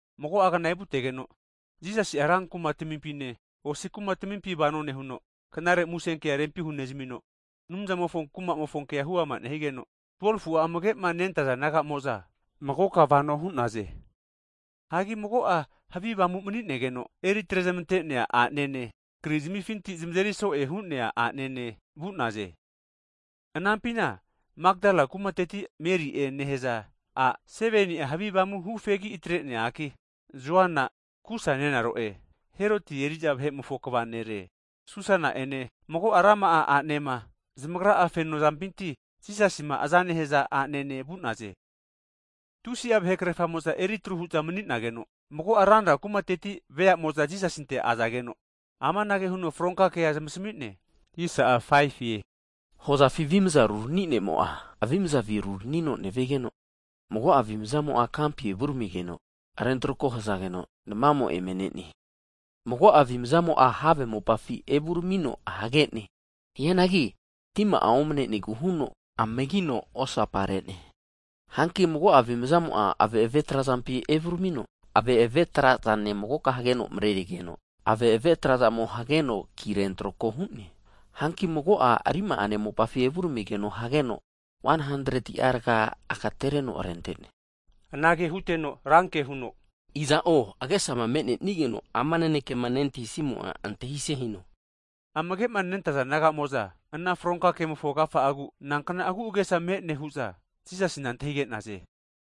Mago'agna evutegeno Jisasi'a rankuma tamimpine, osi kuma tamimpi vano nehuno, Knare Musenkea rempi hunezamino, Anumzamofo Kumamofo kea huama nehigeno, 12fu'a amagema nentaza disaipol nagamo'za magoka vano hu'naze. Hagi mago'a, havi avamu mni'negeno eri atrezmante'nea a'nene, krizimifinti zamazeri so'e hu'nea a'nene vu'naze. Anampina Makdala kumateti Meri'e nehaza a' 7ni'a havi avamu hufegi atre'nea a'ki, Joana Kusa nenaro'e (Heroti eri'za vahe'mofo kva nere) Susana ene, mago'a rama'a a'nema zamagra'a fenozampinti Jisasima azama nehaza a'nene vu'naze. Tusi'a vahe krefamo'za eritru hu'za mani'nageno, mago'a ranra kumateti veamo'za Jisasinte azageno, amanage huno fronka kea zamasmi'ne. Hozafi avimza rurani ne'mo'a, avimaza ruranino nevigeno, mago'a avimzamo'a kampi evuramigeno rentroko hazageno, namamo eme ne'ne. Mago'a avimzamo'a have mopafi evuramino hage'ne, hianagi tima'a omnenegu huno amagino osapa re'ne. Hanki mago'a avimzamo'a ave'ave trazampi evuramino ave'ave trazane magoka hageno mrerigeno, ave'ave trazamo hageno ki rentrako hu'ne. Hanki mago'a rima'ane mopafi evuramino hageno 100ti'a raga'a agatereno rente'ne. Anage huteno ranke huno, iza'o agesama me'nenigeno'a ama nanekema antahisimo'a antahise hino! Amage'ma nentaza disaipol naga'amo'za, ana fronka kemofo agafa'agu, nankna agu'agesa me'ne hu'za Jisasina antahige'naze.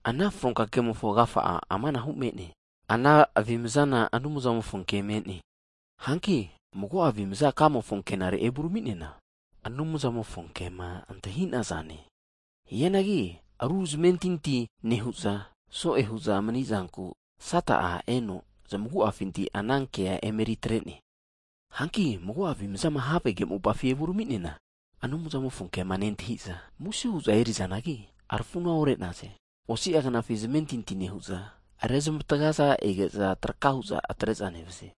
Ana fronka kemofo agafa'a amanahu me'ne. Ana avimazana Anumzamofo ke me'ne. Hanki mago'a avimaza kamofo ankinare evurami'neana, Anumzamofo kema antahinaze. Hianagi aru zamentinti nehu'za so'e hu'za mni'zanku, Sata'a eno zamagu'afinti ana kea emeri atre'ne. Hanki mago'a avimazana havege mopafi evurami'neana, Anumzamofo kema nentahi'za muse huza eri'nazanagi, rafuna ore'naze. Osi'a knafi zmentinti nehu'za, rezmatga'zama ege'za traka hu'za atre'za nevaze.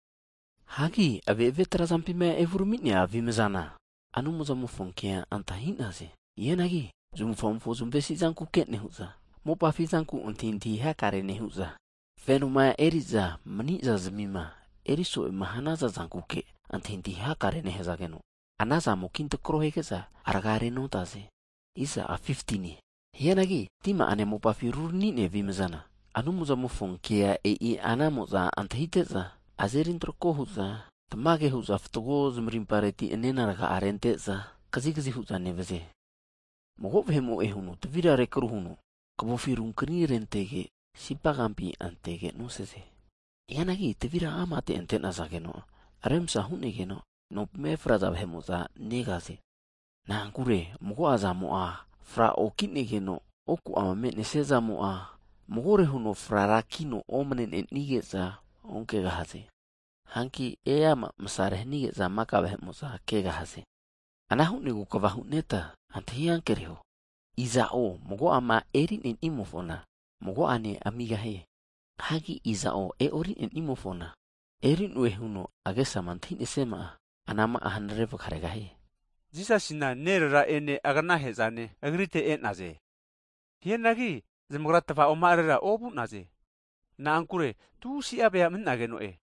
Hagi ave'ave trazampima evurami'nea avimzana, Anumzamofo kea antahi'naze. Hianagi zamavufamofo zavamesi zankuke nehu'za, mopafi zanku antahintahi hakare nehu'za, fenoma eri'za mni'zazmima eri so'e hanaza zankuke antahintahi hakare nehazageno, anazamo kintrako hige'za, rga renontaze. Hianagi tima'ane mopafima rurani'nea avimzana, Anumzamofo kea e'i anamo'za antahite'za azeri antrako hu'za, tamage hu'za fatgo zmarimpareti nena raga'a rente'za kazigazi hu'za nevaze. Mago vahe'mo'e huno tavira rekru huno, kavofi runkni rentege, sipa kampina antege nosaze. Hianagi tavira amate ante'nazageno remsa hu'negeno, nompima efraza vahe'mo'za negaze. Na'ankure mago'zamo'a fraoki'nigeno, oku'ama me'nesiazamo'a magore huno frara kino omne'nenige'za onkegahaze. Hanki eama masare hanige'za maka vahe'mo'za kegahaze. Ana hu'negu kva hu'neta antahi ankereho, iza'o mago'ama eri'nenimofona mago'ane amigahie. Hianagi iza'o e'orinenimofona, eri'noe huno agesama antahisiama'a, anama'a hanare vga regahie. Jisasina nerera'ene agnahe'zane agritega e'naze, hianagi zamagra tvaoma'arera ovu'naze. Na'ankure tusi'a vea mani'nazageno'e.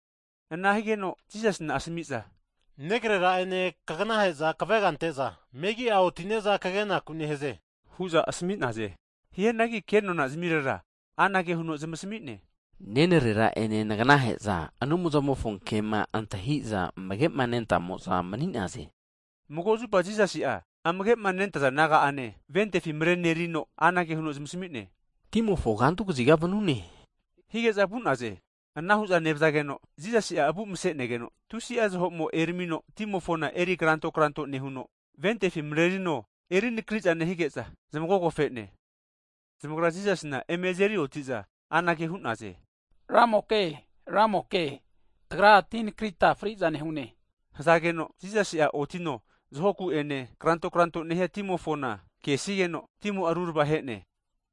Ana higeno Jisaina asami'za, negarera'ene kaganahe'za kavega ante'za megi'a otine'za kagenaku nehaze hu'za asami'naze. Hianagi kenona zimirera anage huno zmasami'ne, nenrera ene naganahe'za, Anumzamofo ke'ma antahi'za amage'ma nentamo'za mani'naze. Mago zupa Jisasi'a amage'ma nentaza disaipol naga'ane ventifi mrenerino anage huno zmasami'ne, timofo kantu kaziga vanune hige'za vu'naze. Ana hu'za nevazageno, Jisasi'a avu mase'negeno, tusi'a zaho'mo eramino timofona eri kranto kranto nehuno, ventefi mrerino erinakriza nehige'za zmagogofene. Zamagra Jisasina eme azeri oti'za anage hu'naze. Ramoke, Ramoke, tagra tinakrita fri'za nehune hazageno, Jisasi'a otino zahoku'ene kranto kranto nehia timofona kesigeno, timo'a rurava he'ne.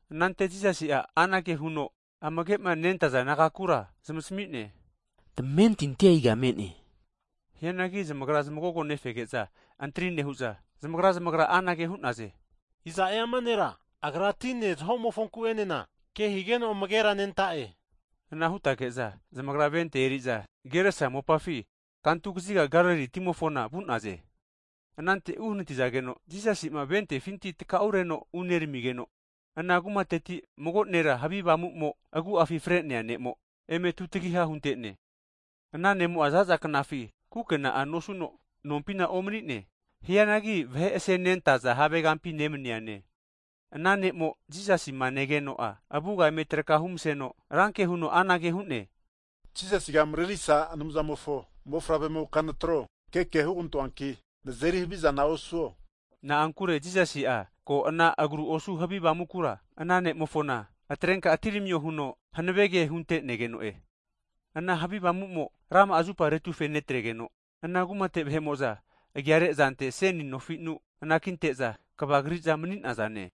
Anante Jisasi'a anage huno amage'ma nentaza disaipol nagakura zmasami'ne, tamentintia iga me'ne? Hianagi zamagra zmagogo nefege'za antri nehu'za, zamagra zamagra anage hu'naze. Iza'e ama nera Agra tine zahomofonku enena ke higeno amagera nenta'e? Ana hutege'za zamagra venti eriza Geresa mopafi kantu kaziga Galili timofona vu'naze. Anante uhnati'zageno Jisasi'ma ventefinti takau reno uneramigeno, ana kumateti mago nera havi avamu'mo agu'afi fre'nea ne'mo eme tutagiha hunte'ne. Ana ne'mo'a zaza knafi kukena'a nosuno, nompina omanine. Hianagi vahe asenentaza havegampi nemniane. Ana nemo Jisasima negeno'a, avuga eme traka humaseno, ranke huno anage hu'ne, Jisasiga Mrerisa Anumzamofo mofavremoka nataro! Keke hugantoanki nazeri havizana osuo! Na'ankure Jisasi'a ko ana agru osu havi avamukura ana nemofona atrenka atiramio huno hanave ke hunte'negeno'e. Ana havi avamumo rama'a zupa retufenetregeno, ana kumate vahe'mo'za agiare azante seni nofinu anakinte'za kavagri'za mani'nazane.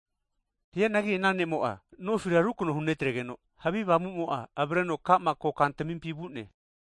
Hianagi ana ne'mo'a, nofira rukno hunetregeno, havi avamumo'a avreno ka'ma kotamimpi vu'ne.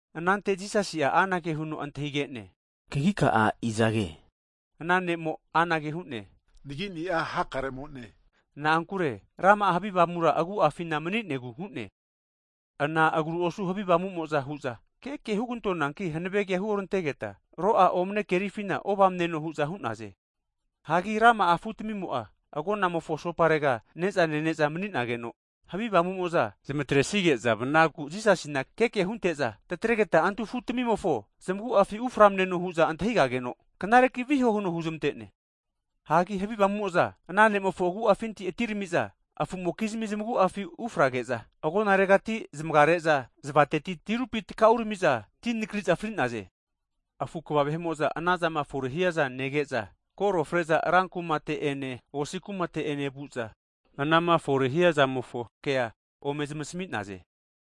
Anante Jisasi'a anage huno antahige'ne, Kagika'a izage? Ana ne'mo anage hu'ne. Nagini'a hakare'mone. Na'ankure rama'a havi avamu agu'afina maninegu hu'ne. Ana agru osu havi avamumo'za hu'za, keke hugantonanki hanave kea hurantegeta ro'a omane kerifina ovamneno hu'za hu'naze. Hagi rama'a afutamimo'a agonamofo asoparega ne'za nene'za mani'nageno, havi avamumo'za zamatresige'za vnagu Jisasina keke hunte'za, tataregeta antu afu tamimofo zmaguafi uframneno hu'za antahigageno, knareki viho huno huzmante'ne. Hanki havi avamumo'za ana ne'mofo agu'afinti atirami'za afu'mokizmi zmagu'afi ufrage'za, agonaregati zmagare'za zavateti tirupi takauramiza ti nakri'za fri'naze. Afu kva vahe'mo'za anazama fore hiaza nege'za, koro fre'za ra kumate'ene osi kumate'ene vu'za, anama fore hiazamofo kea ome zmasami'naze.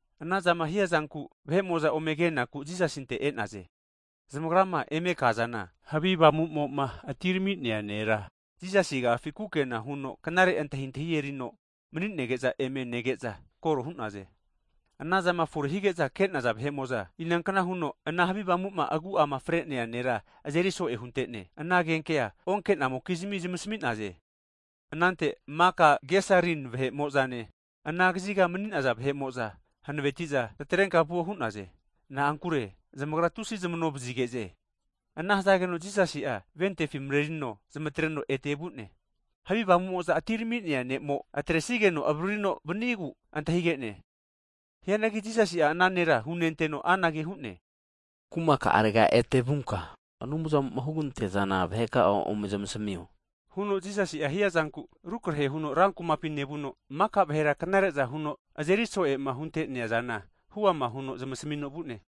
Anazama hiazanku vahe'mo'za ome kenaku Jisasinte e'naze. Zamagrama eme kazana, havi avamuma atirami'nea nera Jisasi agafi kukena huno knare antahintahi erino maninege'za eme nege'za koro hu'naze. Anazama fore hige'za ke'naza vahe'mo'za, inaknahuno ana havi avamuma agu'ama fre'nea nera azeri so'e hunte'ne. Ana agenkea onke'namokizmi zmasami'naze. Anante maka Gesarin vahe'mo'zane, ana kaziga mani'naza vahe'mo'za hanavetiza, tatrenka vuo hu'naze. Na'ankure zamagra tusi zmano vazige'ze. Ana hazageno Jisasi'a ventefi marerino zmatreno ete vu'ne. Havi avamu'mo'za atirami'nea ne'mo atresigeno avaririno vanigu antahige'ne. Hianagi Jisasi'a ana nera hunenteno anage hu'ne. Kuma ka'arega ete vunka, Anumzamo'ma huganteazana vaheka'a ome zmasamio huno Jisasi hiazanku, rukrehe huno ran kumapi nevuno, maka vahera knare'za huno azeri so'ema hunte'neazana huama huno zmasamino vu'ne.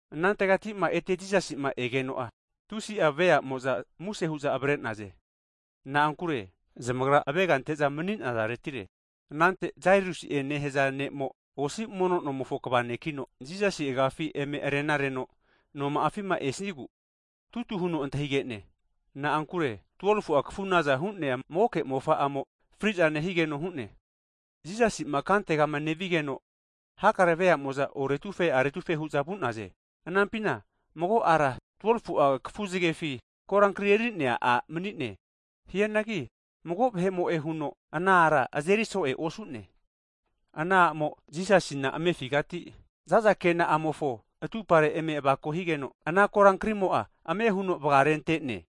Anantegatima ete Jisasima egeno'a, tusi'a veamo'za muse hu'za avre'naze. Na'ankure zamagra avega ante'za mani'nazaretire. Anante Jairusi'e nehaza ne'mo osi mono nomofo kva nekino, Jisasi agiafi eme rena reno noma'afima esigu tutu huno antahige'ne. Na'ankure 12fu'a kafunaza hu'nea magoke mofa'amo, fri'za nehigeno hu'ne. Jisasi'ma kantegama nevigeno, hakare vea'mo'za oretufe aretufe hu'za vu'naze. Anampina mago ara 12fu'a kafu zgefi korankria eri'nea a' mani'ne. Hianagi mago vahe'mo'e huno ana ara azeri so'e osu'ne. Ana a'mo Jisasina amefigati zaza kena'amofo atumpare eme avako higeno, ana korankrimo'a ame huno vgarente'ne.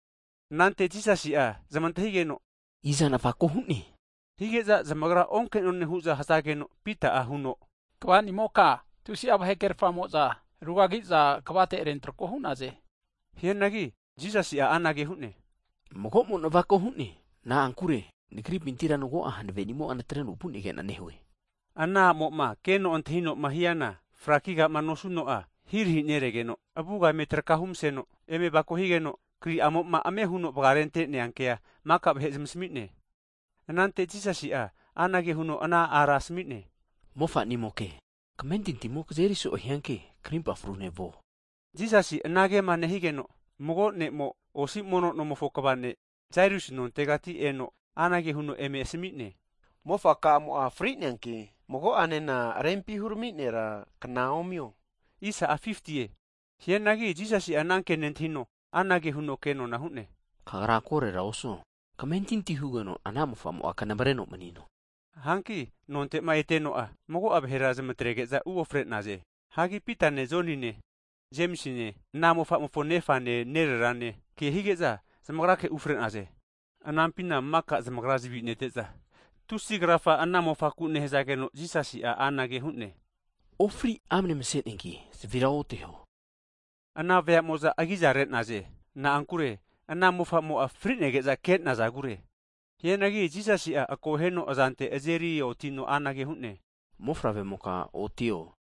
Anante Jisasi'a zmantahigeno, iza navako hu'ne? Hige'za zamagra onke'none hu'za hazegeno, Pita'a huno kva nimoka, tusi'a vahekrefamo'za rugagagiza kavate rentrako hu'naze. Hianagi Jisasi'a anage hu'ne, magomo navako hu'ne, na'ankure Nagripintira mago'a hanave'nimo'a natreno vu'negena nehue. Ana a'mo'ma keno antahinoma hiana, frakigama nosuno'a ahirahi neregeno avuga eme traka humaseno, eme avako higeno, kri'amoma ame huno vgarente'nea kea maka vahe zmasami'ne. Anante Jisasi'a anage huno ana ara asami'ne, Mofamoke, kamentintimo kazeri so'e hianki krimpa frune vuo. Jisasi anagema nehigeno, mago ne'mo osi mono nomofo kava ne' Jairus nontegati eno, anage huno eme asami'ne. Mofa kamo'a fri'neanki mago'anena, Rempima hurami nera kna omio. Hianagi Jisasi' ananke nentahino, anage huno kenona hu'ne. Kagra korora osuo, kamentinti hugeno ana mofamo'a knamareno manino. Hanki nonte'ma eteno'a mago'a vahera zmatrege'za uofre'naze. Hanki Pitane, Jonine, Jemisine ana mofamofo nefane nererane ke hige'za zamagrake ufre'naze. Anampina maka zamagra zavi nete'za tusi krafa ana mofaku nehazageno Jisasi'a anage hu'ne, ofri amne mase'neanki zavira oteho. Ana veamo'za agiza re'naze. Na'ankure ana mofamo'a frinege'za ke'nazagure. Hianagi Jisasi'a akoheno azante azeri otino anage hu'ne, Mofavre'moka otio.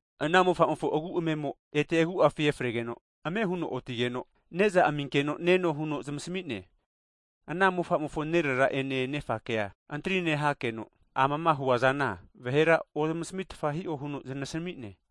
Ana mofamofo agu amemo ete agu'afi efregeno, ame huno otigeno, neza aminkeno neno huno zmasami'ne. Ana mofa'mofo nerera'ene nefakea antri nehakeno, amama huazana vahera ozmasamitfa hi'o huno znasami'ne.